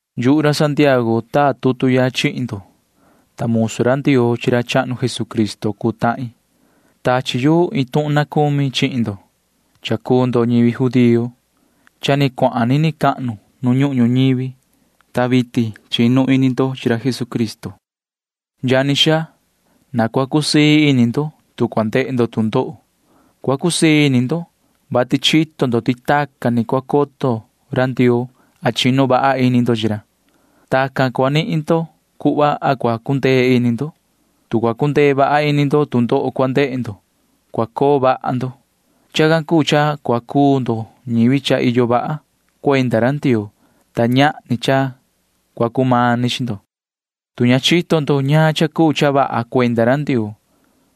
Yuhu ra Santiago taa tutu ya chihin ndo, ta musu ra Ndioo chi ra chahnu Jesucristo cuu tahin. Tachi yu iin tuhun na cumi chihin ndo. Ñivi judío cuu ndo, ta cha ni cuahan ndo nini cahnu nu ñuhun ñuñivi, ta vitin chinu ini ndo chi ra Jesucristo. Yani xaa, na cua cusii ini ndo, tu cua ndehe ndo tu ndoho. Cua cusii ini ndo, vati chito ndo ti tacan ni cua coto ra Ndioo a chinu vaha ini ndo chi ra. Tacan ni nihin ndo cuhva cha cua cundee ini ndo. Tu cua cundee vaha ini ndo tu ndoho cua ndehe ndo, cua coo vaha ndo. Chacan cuu cha cua cuu ndo ñivi cha iyo vaha cuenda ra Ndioo, ta ñahni cha cua cumani chi ndo. Tu ña chito ndo ñaan cha cuu cha vaha cuenda ra Ndioo,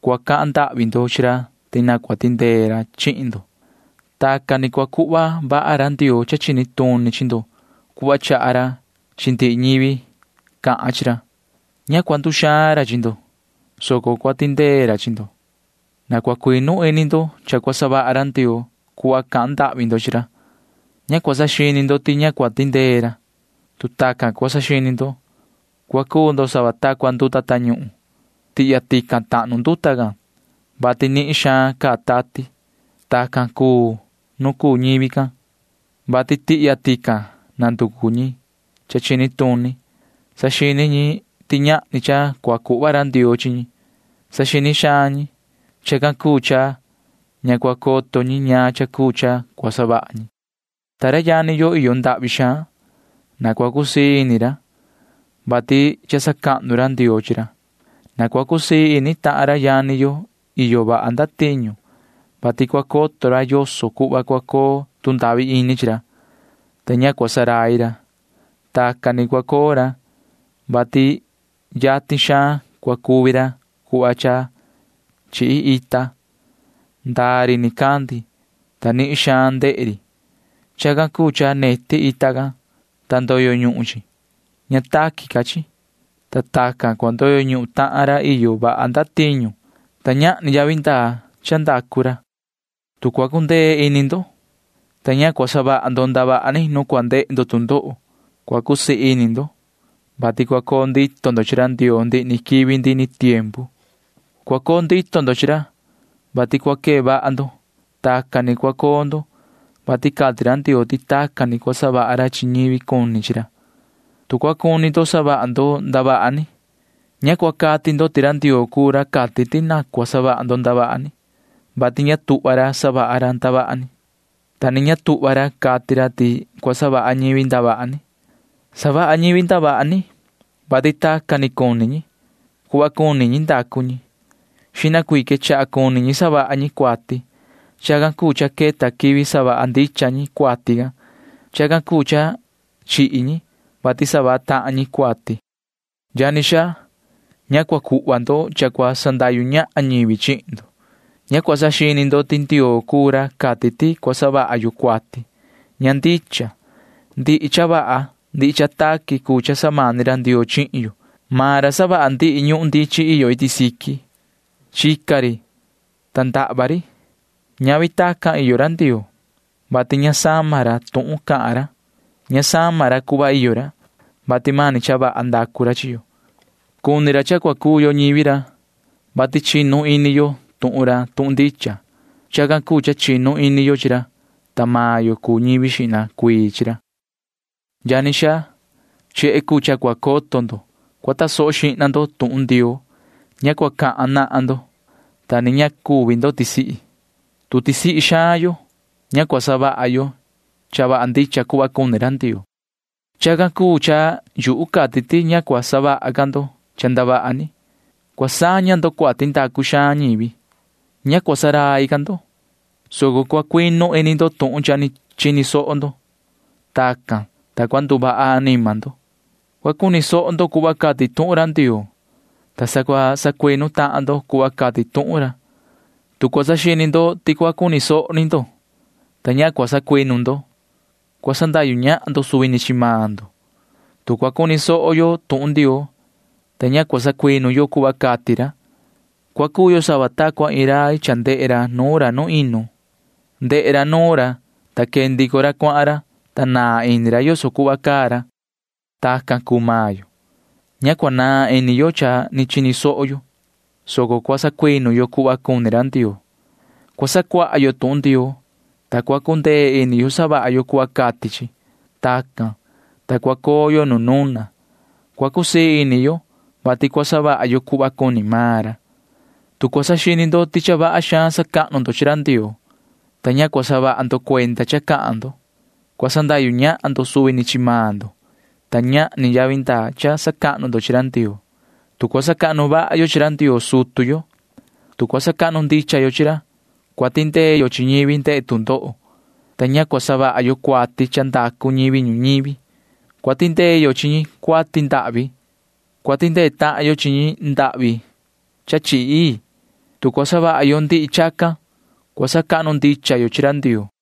cua cahan ndahvi ndo chi ra ti na cua tindee ra chihin ndo. Tacan ni cua cuhva vaha ra Ndioo cha chini tuni chi ndo cuhva chaha ra chi ndihi ñivi cahan chi ra. Ña cua nduxaan ra chi ndo, soco cua tindee ra chi ndo. Na cua cuinu ini ndo cha cua savaha ra Ndioo cuhva cahan ndahvi ndo chi ra. Ña cua saxini ndo ti ña cua tindee ra. Tu cua saxini ndo, cua cuu ndo sava ta cua nduta tañuhun. Tihya tican tahnu nduta can, vati nihin xaan caa tati. Tacan cuu nu cuu ñivi can, vati tihya tican nanducu ñi cha chini tuni chi ñi. Ña cua saxini ñivi can ti iyo cha cua cuhva ra Ndioo chi ñi. Saxini xaan ñi. Chacan cuu cha ña cua coto ñi ñaan cha cuu cha cua savaha ñi. Ta ra yani yo iyo ndahvi xaan―na cua cusii ini ra, vati cha sacahnu ra Ndioo chi ra. Na cua cusii ini tahan ra yani yo iyo vaha ndatiñu, vati cua coto ra yoso cuhva cua coo tu ndahvi ini chi ra, ta ña cua ndurai ra. Tacan ni cua coo ra, vati yatin xaan cua cuvi ra cuhva cha chihi ita. Ndaa ri nicandi, ta nihin xaan ndehe ri. Chacan cuu cha neti ita can, ta ndoyo ñuhun chi. Ña taqui ca chi. Ta tacan cua ndoyo ñuhun tahan ra iyo vaha ndatiñu, ta ñahni yavi ndaa cha ndacu ra. Tu cua cundee ini ndo, ta ña cua savaha ndo ndavaha ni nu cua ndehe ndo tu ndoho, cua cusii ini ndo, vati cua coo ndito ndo chi ra Ndioo ndihi ni quivi ndihi ni tiempu. Cua coo ndito ndo chi ra, vati cua quee vaha ndo. Tacan ni cua coo ndo, vati cati ra Ndioo ti tacan ni cua savaha ra chi ñivi cuni chi ra. Tu cua cuni ndo savaha ndo ndavaha ni, ña cua cati ndo ti ra Ndioo cuu ra cati ti na cua savaha ndo ndavaha ni, vati ña tuhva ra savaha ra ndavaha ni, ta ni ña tuhva ra cati ra ti cua savaha ñivi ndavaha ni. Savaha ñivi ndavaha ni, vati tacan ni cuni maan ñi. Cuhva cuni ndicha ñi savaha ñi. Xihna cuii quechaha cuni ñi savaha ñi cuati. Chacan cuu cha queta quivi savaha ndicha ñi cuati can. Chacan cuu cha chihi tahan ñi, vati savaha tahan ñi cuati. Yani xaa, ña cua cuhva ndo cha cua sandahyu ñahan ñivi chihin ndo. Ña cua saxini ndo ti Ndioo cuu ra cati ti cua savaha yo cuati. Ña ndicha. Ndihi cha vaha ndihi cha taqui cuu cha samani ra Ndioo chihin yo. Maan ra savaha ndihi ñuhun ndichin iyo iti siqui. Chica ri, ta ndahva ri. Ñavi tacan iyo ra Ndioo, vati ña sama ra tuhun cahan ra. Ña sama ra cuhva iyo ra, vati mani cha vaha savaha ra chi yo. Cuni maan ra cha cua cuu yo ñivi ra, vati chinu ini yo tuhun ra tuhun ndicha. Chacan cuu cha chinu xihna ini yo chi ra, ta ñivi xihna cuii ra cuu yo. Yani xaa, chehe cuu cha cua coto ndo. Cua tasoho xihna ndo tuhun Ndioo. Ña cua cahan nahan ndo, ta ni ña cua nduxaan ndo. Tu cua cuxaan yo, ña cua savaha yo cha vaha ndicha cuhva cuni ra Ndioo. Chacan cuu cha yuhu cati ti ña cua savaha ca ndo cha ndavaha ni. Cua saña ndo cuati ndacu xaan ñivi. Ña cua ndurai ca ndo, soco cua cuinu ini ndo tuhun cha ni chini soho ndo. Tacan, ta cua nduvaha anima ndo. Cua cuni soho ndo cuhva cati tuhun ra Ndioo, ta sa cua sacuinu tahan ndo cuhva cati tuhun ra. Tu cua saxini ndo ti cua cuni soho ni ndo, ta ña cua sacuinu ndo, cua sandahyu ñahan ndo suvi ni chi maan ndo. Tu cua cuni soho yo tuhun Ndioo, ta ña cua sacuinu yo cuhva cati ra, cua cuu yo sava ta cua iin rai ndehe nuun ra chi nuun inu. Ndehe ra nuun ra, ta quee ndico ra cuahan ra, ta naan ini ra yoso cuhva caa ra. Tacan tucu maan yo―ña cua naan ini yo cha ni chini soho yo, soco cua sacuinu yo cuhva cuni ra Ndioo. Cua sacuaha yo tuhun Ndioo, ta cua cundee ini yo savaha yo cuhva cati chi. Tacan, ta cua coo yo nu nuna. Cua cusii ini yo, vati cua savaha yo cuhva cuni maan ra. Tu cua saxini ndo ti cha vaha xaan sacahnu ndo chi ra Ndioo, soco ña cua saha ndo cuenda cha cahan ndo, cua sandahyu ñahan ndo suvi ni chi maan ndo, ta ñahni yavi ndaa cha sacahnu ndo chi ra Ndioo. Tu cua sacahnu vaha yo chi ra Ndioo sutu yo, tu cua sacahnu ndicha yo chi ra, cua tindee yo chi ñivi ndehe tu ndoho, ta ña cua savaha yo cuati cha ndacu ñivi ñuñivi. Cua tindee yo chi ñi cuati ndahvi. Cua tindee tahan yo chi ñi ndahvi cha chihi ii. Tu cua savaha yo ndihi chacan, cua sacahnu ndicha yo chi ra Ndioo.